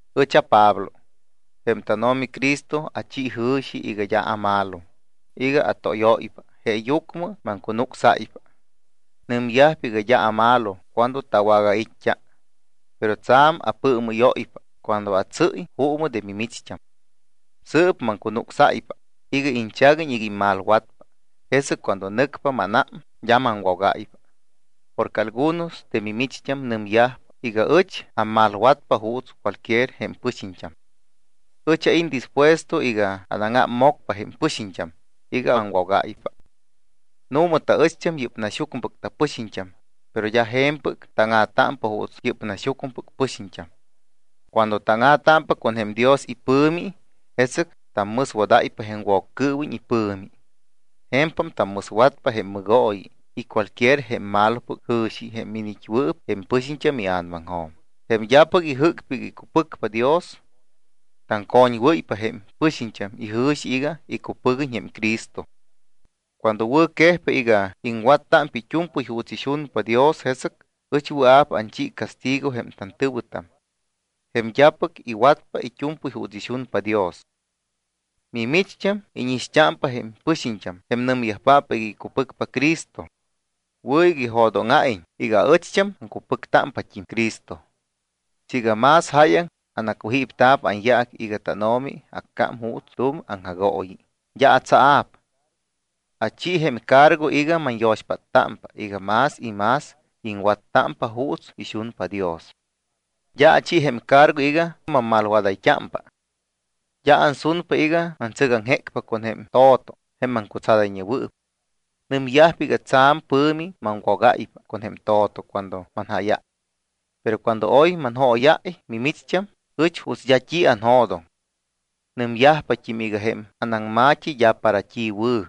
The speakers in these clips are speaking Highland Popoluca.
Ɨch aPablo. Jém tánO̱mi Cristo achi jɨ̱xi iga d́a amalo, iga atóyóypa, jeeyucmɨ maŋcunucsáypa. Nɨmyajpa iga d́a amalo cuando tawagait́t́a, pero tsa̱m apɨɨmɨ́yóypa cuando atsɨ́y juumɨ de mimicht́am. Sɨɨp maŋcunucsáypa iga iñchaguiñ iga immalwatpa, jesɨc cuando nɨcpa mánám, d́a maŋwogáypa. Porque algunos de mimicht́am nɨmyajpa iga ɨch ammalwatpa juuts cualquier jém pɨxiñt́am. Ɨch ait́ dispuesto iga anáŋámmocpa jém pɨxiñt́am iga aŋwogáypa. Nu̱ma taɨcht́am yɨ́p naxyucmɨpɨc tapɨxiñt́am, pero d́a je̱mpɨc táŋa̱támpa juuts yɨ́p naxyucmɨpɨc pɨxiñt́am. Cuando táŋa̱támpa con jém Dios ipɨ̱mi, jesɨc tammɨswadáypa jém Woccɨɨwiñ ipɨ̱mi. Je̱mpam tammɨswatpa jém mɨgooyi y cualquier jém malopɨc jɨ̱xi jém iniit́wɨɨp jém pɨxiñt́am ia̱namaŋjo̱m, jém d́apɨc ijɨ́cpa iga icupɨcpa Dios. Taŋcoñwɨ́ypa jém pɨxiñt́am ijɨ̱xi iga icupɨguiñ jém Cristo. Cuando wɨ̱quejpa iga iŋwattámpa it́u̱mpɨy juuts ixunpa Dios, jesɨc ɨch wɨa̱p anchi castigo jém tantɨ̱wɨtam, jém d́apɨc iwatyajpa it́u̱mpɨy juuts ixunpa Dios. Mimicht́am íñixt́ámpa jém pɨxiñt́am jém nɨmyajpáppɨc iga icupɨcpa Cristo. Wɨ̱ iga ijo̱dóŋa̱iñ iga aɨcht́am aŋcupɨctámpat́im Cristo. Siiga más jáyaŋ anacujípta̱p anyaac iga tánO̱mi accám juuts tu̱m aŋjagooyi, d́a atsaa̱p. Achi jém cargo iga manyo̱xpáttámpa iga más y más iŋwattámpa juuts ixunpa Dios. D́a achi jém cargo iga mammalwadayt́ámpa. D́a ansunpa iga mantsɨgaŋjecpa con jém to̱to jém maŋcutsadayñewɨɨp. Nɨmyajpa iga tsa̱m pɨ̱mi maŋwogáypa con jém to̱to cuando manjáyáy. Pero cuando oy manjóyáy mimicht́am, ɨch juuts d́a t́i anjo̱doŋ. Nɨmyajpat́im iga jém anaŋma̱t́i d́a para t́i wɨ̱.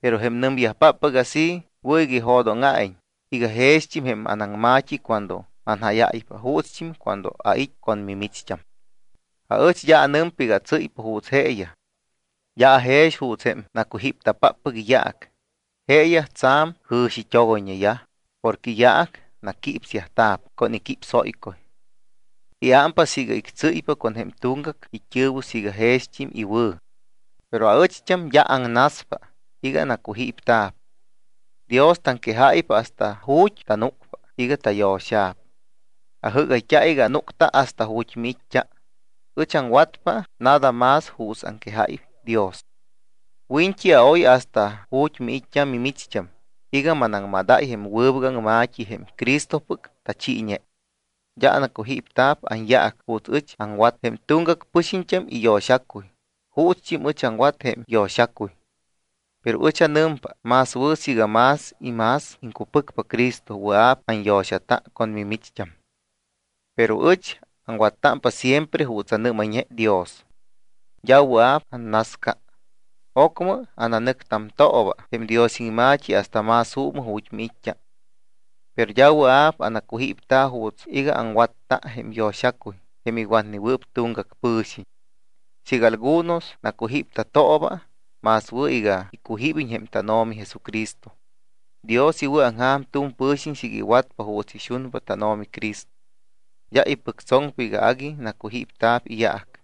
Pero jém nɨmyajpáppɨc así wɨ̱ iga ijo̱dóŋa̱iñ iga jext́im jém anaŋma̱t́i cuando manjáyáypa juutst́im cuando ait́ con mimicht́am. Aɨch d́a anɨmpa iga atsɨ́ypa juuts jeeyaj. D́a ajex juuts jém nacujípta̱páppɨc iyaac. Jeeyaj tsa̱m jɨ̱xit́ogoyñeyaj porque iyaac naquípsyajt́a̱p con iquípsóycuy. Iámpa siiga ictsɨ́ypa con jém tuŋgac it́ɨ̱wɨ siiga jext́im iwɨ̱. Pero aɨcht́am d́a aŋnaspa iga anacujípta̱p. Dios taŋquejáypa hasta ju̱t́ tanúcpa iga tayo̱xa̱p. Ajɨ́gayt́a iga anúcta hasta ju̱t́ miit́t́a. Ɨch aŋwatpa nada más juuts aŋquejáy Dios. Wiñt́i aoy hasta ju̱t́ miit́t́a mimicht́am iga manaŋmadáy jém wɨbɨc aŋma̱t́i jém Cristopɨc tachiiñe. D́a anacujípta̱p anyaac juuts ɨch aŋwat jém tuŋgac pɨ̱xiñ iyo̱xacuy juutst́im ɨch aŋwat jém yo̱xacuy. Pero ɨch anɨmpa más wɨ̱ siiga más y más iŋcupɨcpa Cristo wɨa̱p anyo̱xata con mimicht́am. Pero ɨch aŋwattámpa siempre juuts anɨ́mayñe Dios. D́a wɨa̱p annasca. Ocmɨ ananɨctamtooba jém Dios iŋma̱t́i hasta más juumɨ ju̱t́ miit́t́a. Pero d́a wɨa̱p anacujípta̱ juuts iga aŋwatta jém yo̱xacuy jém iwatnewɨɨp tuŋgac pɨ̱xiñ. Siiga algunos nacujípta̱tooba, más wɨ̱ iga icujíbiñ jém tánO̱mi Jesucristo. Dios iwɨ̱aŋja̱m tu̱m pɨ̱xiñ siiga iwatpa juuts ixunpa tánO̱mi Cristo. D́a ipɨctsoŋpa iga agui nacujípta̱p iyaac.